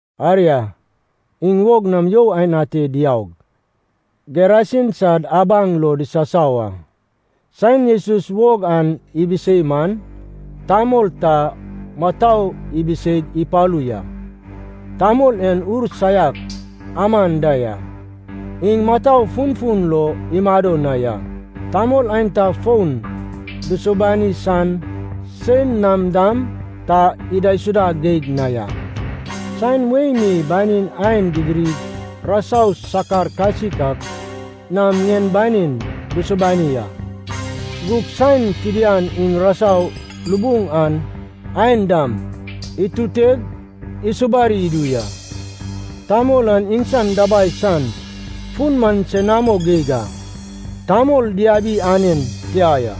Aria, iŋ wog nam you aen ate diaug, Gerasin sad abaŋ lo disasau a. Saen Jesus wog an ibisei man, tamol ta mutou ibiseig ipalu ya. Tamol en ur saiak aman da ya. Iŋ mutou funfun lo imado na ya. Tamol aenta fon dusubani san, sein nam dam ta idaisuda geig na ya. Saen wei mi banin ain didirig rasau sakar kasik ak nam ŋien banin dusubani a. Gug saen fidian iŋ rasau lubuŋ an ain dam ituteg isubari idu ya. Tamol an iŋsan dabai san fun man senamo geig a, tamol diabi anen tia ya.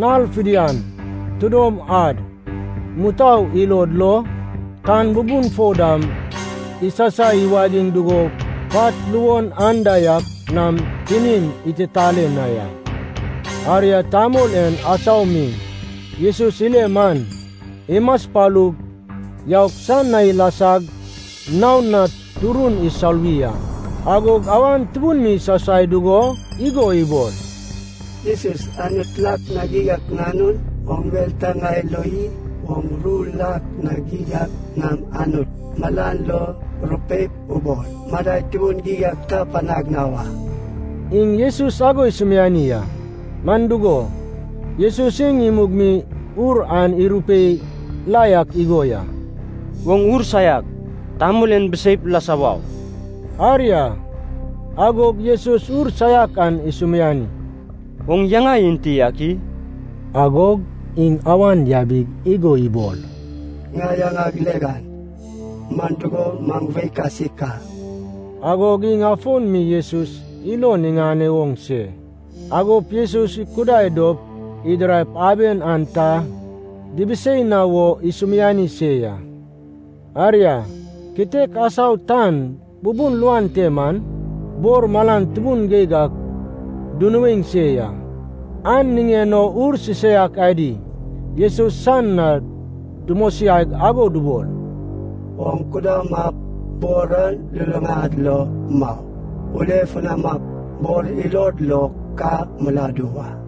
Nal fidian, tidom ad, mutou ilod lo, tan bubun fo dam isasai iwagiŋ dugo pat luon anda yak nam tinin ititale na ya. Aria, tamol en asau mi Jesus ile man, imaspalug yaug san na ilasag naon na turun isoluwi a. Agog awan tubun mi isasai dugo igo ibol, “Jesus, Anut lak na geig ak Nanun, oŋ mel ta ŋai lo i? Oŋ ru lak na geig ak nam Anut malan lo rupeip ubol, madai tubun geig ta panag na wa.” Iŋ Jesus ago isumiani a, man dugo, Jesus iŋ imug mi ur an irupei la yak igo ya, “Oŋ ur saiak, tamol en biseip lasa wau!” Aria, agog Jesus ur saiak an isumiani, “Oŋ yaŋa enti ak i?” Agog iŋ awan yabig igo ibol, “Ŋai yaŋag Legen, man dugo, maŋ wei kasik a.” Agog iŋ afon mi Jesus ilon iŋane oŋ se, agop Jesus ikudai dop idiraip aben an ta dibisei na wo isumiani se ya. Aria, kitek asau tan bubun luan te man, bor malan tubun geig ak dunuaeŋ se ya. An niŋen o ur sisaiak adi Jesus san na dumosiaig ago dubol, “Oŋ kudamap bor an luluŋad lo mau. Ulefunamap bor ilod lo ka miladu wa.”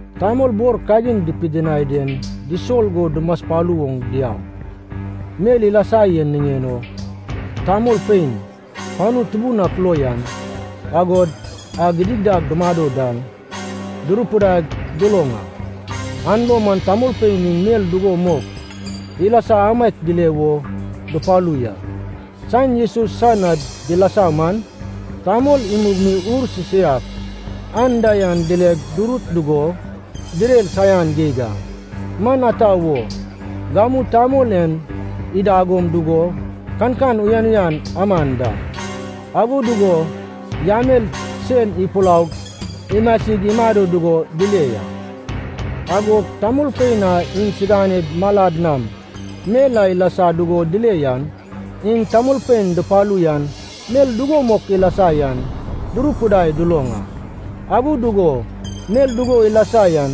Tamol bor kagin dupidinai den disol go dumaspalu oŋ diaug, mel ilasa yan niŋen o tamolpein panu tubun ak lo yan, agod a gidigidad dumado dan, durupidaig duloŋ a. An lo man tamolpein iŋ mel dugo mok ilasa amaiak dile wo dupalu ya. Saen Jesus san na dilasa man, tamol imug mi ur sisaiak anda yan dileg durut dugo direr saian geig a. Man ata wo, gamu tamol en idagom dugo kankan uyan uyan aman da, ago dugo yamel sen ipulaug imasig imado dugo dile ya. Agod tamolpein a iŋsiganed malad nam mel a ilasa dugo dile yan, iŋ tamolpein dupalu yan mel dugo mok ilasa yan durupidaig duloŋ a. Ago dugo mel dugo ilasa yan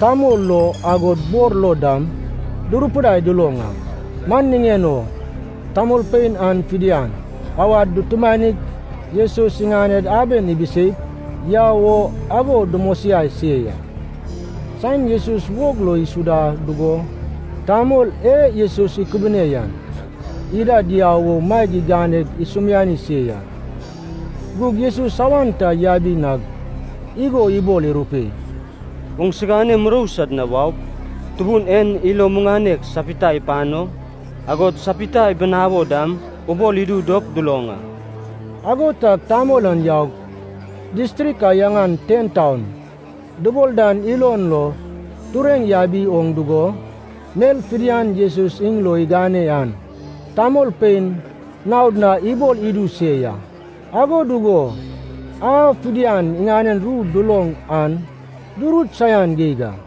tamol lo agod bor lo dam, durupidaig duloŋ a. Man niŋen o tamolpein an fidian awad dutumanig Jesus iŋaned aben ibiseip yau o ago dumosiai se ya. Saen Jesus wog lo isuda dugo tamol e Jesus ikubune yan ida diau o maeg iganeg isumiani se ya. Gug Jesus awan ta yabi nag igo ibol irupei, “Oŋsigane murou sad na waup, Tubun en ilo muŋanek sapita ipano, agod sapita ibinawo dam ubol idu dop duloŋ a.” Ago tag tamol an yaug, distrik a yaŋan TenTaun dubol dan ilon lo tureŋ yabi oŋ dugo, mel fidian Jesus iŋ lo igane an tamolpein naod na ibol idu se ya. Ago dugo a fidian iŋanen ru duloŋ an durut saian geig a.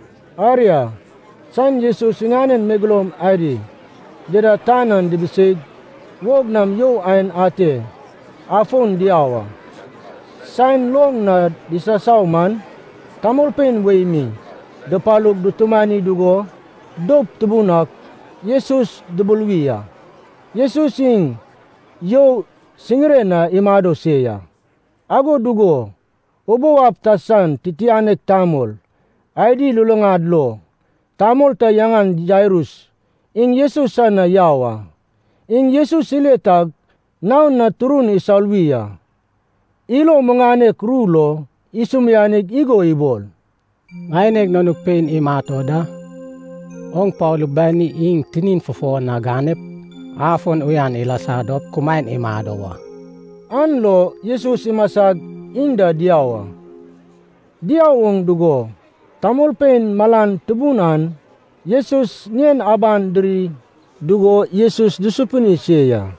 Aria, saen Jesus iŋanen megeloum adi dida tan an dibiseig, wog nam you aen ate afon diau a. Saen loŋ na disasau man, tamolpein wei mi dupalug dutumani dugo doup tubun ak Jesus dubuluwi a. Jesus iŋ you siŋiren na imado se ya. Ago dugo ubou ab ta san titianek tamol adi luluŋad lo tamol ta yaŋan Jairus iŋ Jesus san na yau a. Iŋ Jesus ile tag naon na turun isoluwi a. Ilo muŋanek ru lo isumianig igo ibol, “Ŋaineg nanug pein imat o da. Oŋ palu, bani iŋ tinin fufo na ganep, afon uyan ilasa dop kumaen imado wa.” An lo Jesus imasag iŋ da diau a. Diau oŋ dugo tamolpein malan tubun an Jesus ŋien aban diri dugo Jesus dusupini se ya.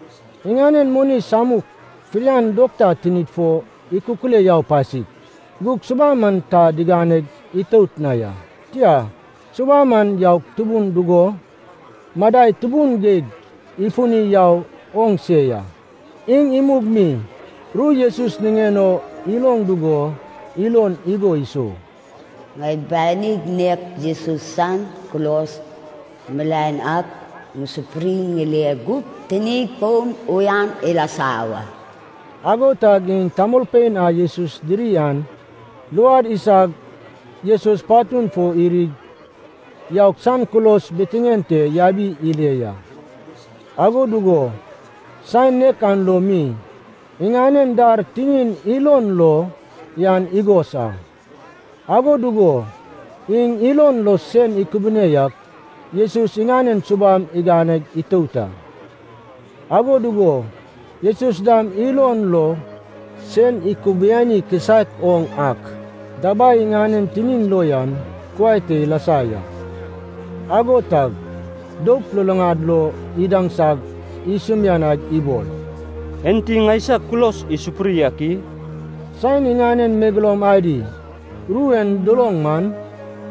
Iŋanen moni samun fidian dokta tinid fo ikukule yau pasik, gug subam an ta digane itout na ya. Tia, subam an yau tubun dugo madai tubun geig ifuni yau oŋ se ya. Iŋ imug mi ru Jesus niŋen o iloŋ dugo ilon igo isou, “Ŋai banig nek Jesus san kulos milaen ak ŋusupuri ŋile gup, tinig fon uyan ilasa wa.” Ago tag iŋ tamolpein a Jesus diri an luad isag Jesus patun fo irig yaug san kulos bitiŋen te yabi ile ya. Ago dugo saen nek an lo mi iŋanen dar tinin ilon lo yan igos a. Ago dugo iŋ ilon lo sen ikubiani ak Jesus iŋanen subam igane itout a. Ago dugo Jesus dam ilon lo sen ikubiani kisaek oŋ ak dabai iŋanen tinin lo yan kuai te ilasa ya. Ago tag doup luluŋad lo idaŋsag isumianaig ibol, “Enti ŋaisag kulos isupuri ak i?” Saen iŋanen megeloum adi ru en duloŋ man,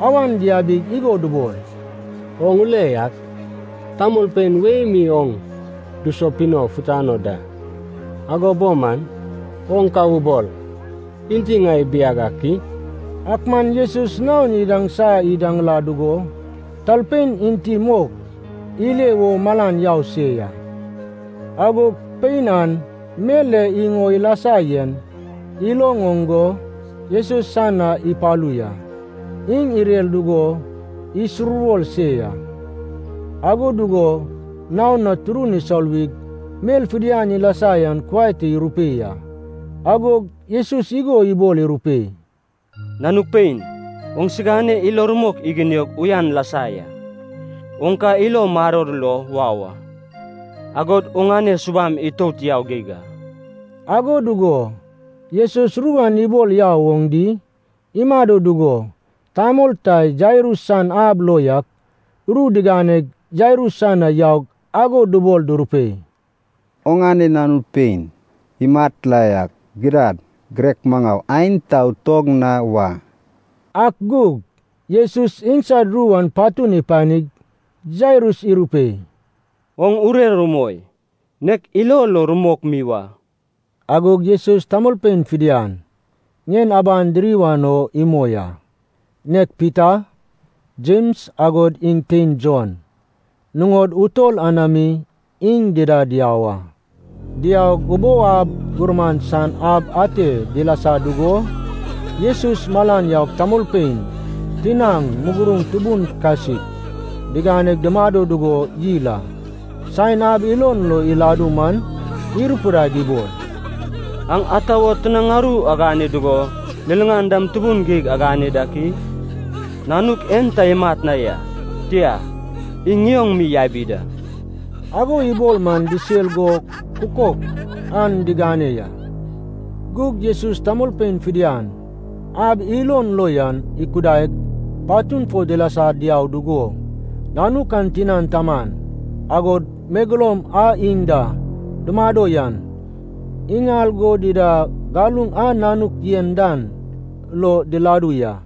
awan diabig igo dubol, “Oŋ ule yak, tamolpein wei mi oŋ dusupino futano da, ago bo man oŋ ka ubol ‘Enti ŋai ibiag ak i?’” Ak man Jesus naon idaŋsa idaŋla dugo talpein enti mok ile wo malan yau se ya. Agog pein an, mel e iŋ o ilasa yen iloŋ oŋ go Jesus san na ipalu ya. Iŋ irer dugo isuruwor se ya, ago dugo naon na turun isoluwig mel fidian ilasa yan kuai te irupei a. Agog Jesus igo ibol irupei, “Nanug pein, oŋsigane ilo rumok iginiog uyan lasa ya. Oŋ ka ilo maror lo wau a, agod oŋane subam itout yau geig a.” Ago dugo Jesus ru an ibol yau oŋ di imado dugo, tamol ta Jairus san ab lo yak ru diganeg Jairus san na yaug ago dubol durupei, “Oŋane nanu pein imat la ya. Gidad, girek maŋau aen ta utog na wa.” Ak gug Jesus iŋsad ru an patun ipanig, Jairus irupei, “Oŋ urer umoi. Nek ilo lo rumok mi wa.” Agog Jesus tamolpein fidian ŋien aban diri wan o imoi a, nek Pita, Jems agod iŋ tein Jon, nuŋod utol anami iŋ dida diau a. Diaug, ubou ab gurman san ab ate dilasa dugo Jesus malan yaug tamolpein tinaŋ muguruŋ tubun kasik diganeg dumado dugo yil a. Saen ab ilon lo iladu man, irupidaig ibol, “Aŋ ata wo tinaŋ aru agane dugo liliŋan dam tubun geig agane dak i? Nanuk en ta imat na ya. Tia, iŋ ŋioŋ mi yabi da.” Ago ibol man disel go kukok an digane ya. Gug Jesus tamolpein fidian ab ilon lo yan ikudaig, patun fo dilasa diau dugo, nanuk an tinan taman, agod megeloum a iŋ da dumado yan, iŋal go dida galuŋ a nanuk yen dan lo diladu ya.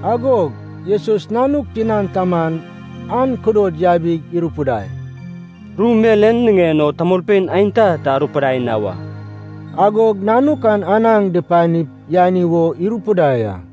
Agog Jesus nanuk tinan taman an kudod yabig irupidai, “Ru mel en niŋen o tamolpein aenta ta arupidai na wa!” Agog nanuk an anaŋ dupanip yani wo irupidai a.